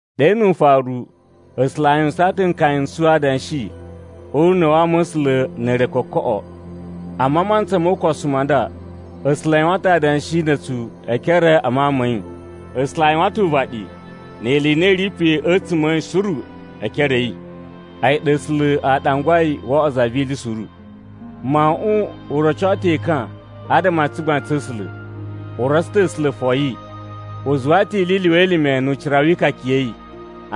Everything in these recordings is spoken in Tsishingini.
Ɗe nu ufaru, A̱sula̱ a yuwusaan ta̱ nkaya n tsu adanshi o una̱ wa ama̱sula̱ na̱ re kokoꞌo. Amma a mantsa mo ukosu ma nda, A̱sula̱ a yuwan ta̱ adanshi na̱ a̱tsu e ekere a Mawun ma̱ yi. A̱sula̱ a yuwan ta̱ uvaɗi ni ili i na i ri pe a̱tsuma̱ a̱ yi suru e ekere a̱ yi. A̱yi ɗa A̱sula̱ a ɗangwai wo oꞌwo za vi ili suru. Mawuꞌun u roco ta̱ ekan adama a tsugbain tsa̱ A̱sula̱, u rotso ta̱ A̱sula̱ foyi. U zuwa ta̱ ili i lyuwa elime nu ucira wi ikaka ya̱ yi.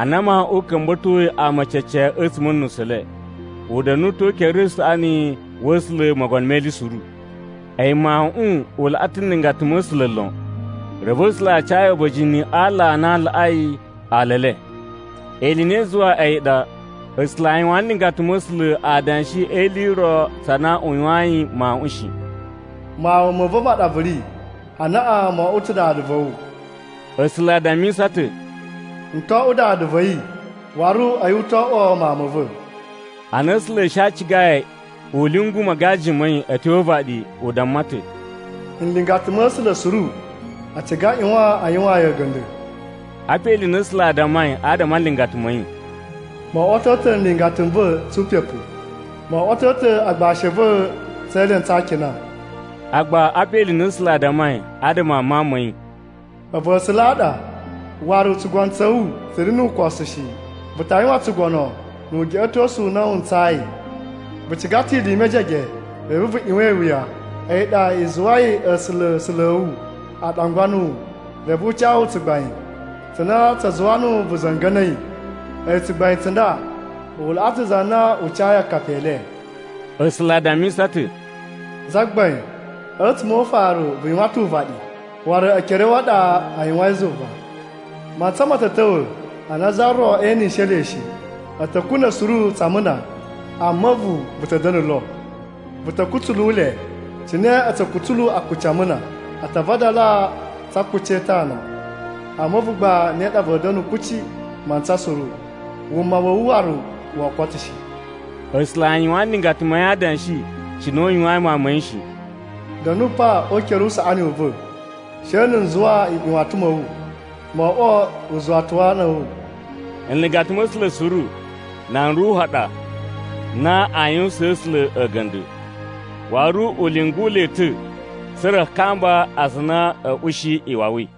Ana Mawuꞌun u ka̱mba̱toi ama cece a̱tsuma̱ a̱ nusu le, u da̱nu ta̱ o ukere usaꞌani wa̱ A̱sula̱ Mogono me Ili Suru. A̱yi Mawuꞌun u laꞌa ta̱ nlingata ma̱ A̱sula̱ lon. Reve A̱sula̱ a ca yi a̱ba̱jini a aala a na a laꞌai ala e le. Ili i na i zuwai a̱yi ɗa A̱sula̱ a yuwaan nlingata ma̱ A̱sula̱ adanshi e ili i ro tsa na u yuwayin Mawuꞌun shi, “Mawun ma̱ va̱ ma ɗa vu ri. Anaꞌan mo oꞌwo ta̱ Dada va̱ wu.” A̱sula̱ a dammisa ta̱, “N to oꞌwo Dada va̱ yi, waru a̱yi u to oꞌwo Mawun ma̱ va̱.” Ana A̱sula̱ a̱ shi a cigai u lyungu magaji ma̱ yi a̱ tyo o uvaɗi, u damma ta̱, “Nlingata ma̱ A̱sula̱ suru a ciga a ꞌyuwan a yuwaan yi a̱ga̱nda̱.” Apa ili i na A̱sula̱ a dammai adama a nlingata ma̱ yi, “Mo oꞌwoto ta̱ nlingata n va̱ tsu upepu. Mo oꞌwoto ta̱ agbashi a̱ va̱ tse elentsu a akina.” Agba apa ili i na A̱sula̱ a dammai adama a Mawun ma̱ yi, “A̱vu A̱sula̱ a ɗa, waru tsugono tsa̱ wu tsa̱ ri nu ukosu shi. Vu ta yuwan tsugono nu ugeꞌetosu u na wu ntsayi. Vu ciga ta̱ ili i mejege reve vu ꞌyuwan iwuya. A̱yi ɗa i zuwai A̱sula̱, A̱sula̱ a̱ wu, a ɗangwa nuwu, reve u ca wu tsugbain tsa na tsa zuwa nuwu vu za̱nga̱na̱i. A̱yi tsugbain tsa nda u laꞌa ta̱ za na u cayi akapi e le.” A̱sula̱ a dammisa ta̱, “Zagbain, a̱tsuma̱ o ufaru vu yuwan ta̱ uvaɗi, waru ekere a̱ wu a ɗa a yuwain zuva. Mantsa ma̱ ta̱ ta̱wa̱ ana za ro enishe le shi, A̱ ta̱ kuna̱ suru tsa amuna. Amma a̱vu vu ta̱ da̱na̱ lo. Vu ta̱ kutsulu le cine a̱ tsu kutsulu akuci a amuna. A ta vadala tsa akuci e itana. Amma a̱vu gba ne ɗa va̱a̱ da̱na̱ kuci mantsa suru, wuma wa̱ wu waru woo koto shi.” A̱sula̱ a yuwaan nlingata ma̱ yi adanshi cine u yuwayin Mawun ma̱ yi shi, “Da̱nu pa o ukere usaꞌani u va̱ she na̱ n zuwa nꞌyuwatan ma̱ wu mo oꞌwo uzuwata wa ana a̱ wu.” Nlingata ma̱ A̱sula̱ suru nan ruhu ɗa na aa yuwusaan A̱sula̱ a̱ga̱nda̱, waru u lyungu le ta̱ tsa̱ra̱ a kamba aza a na a̱a̱ ushi iwawi.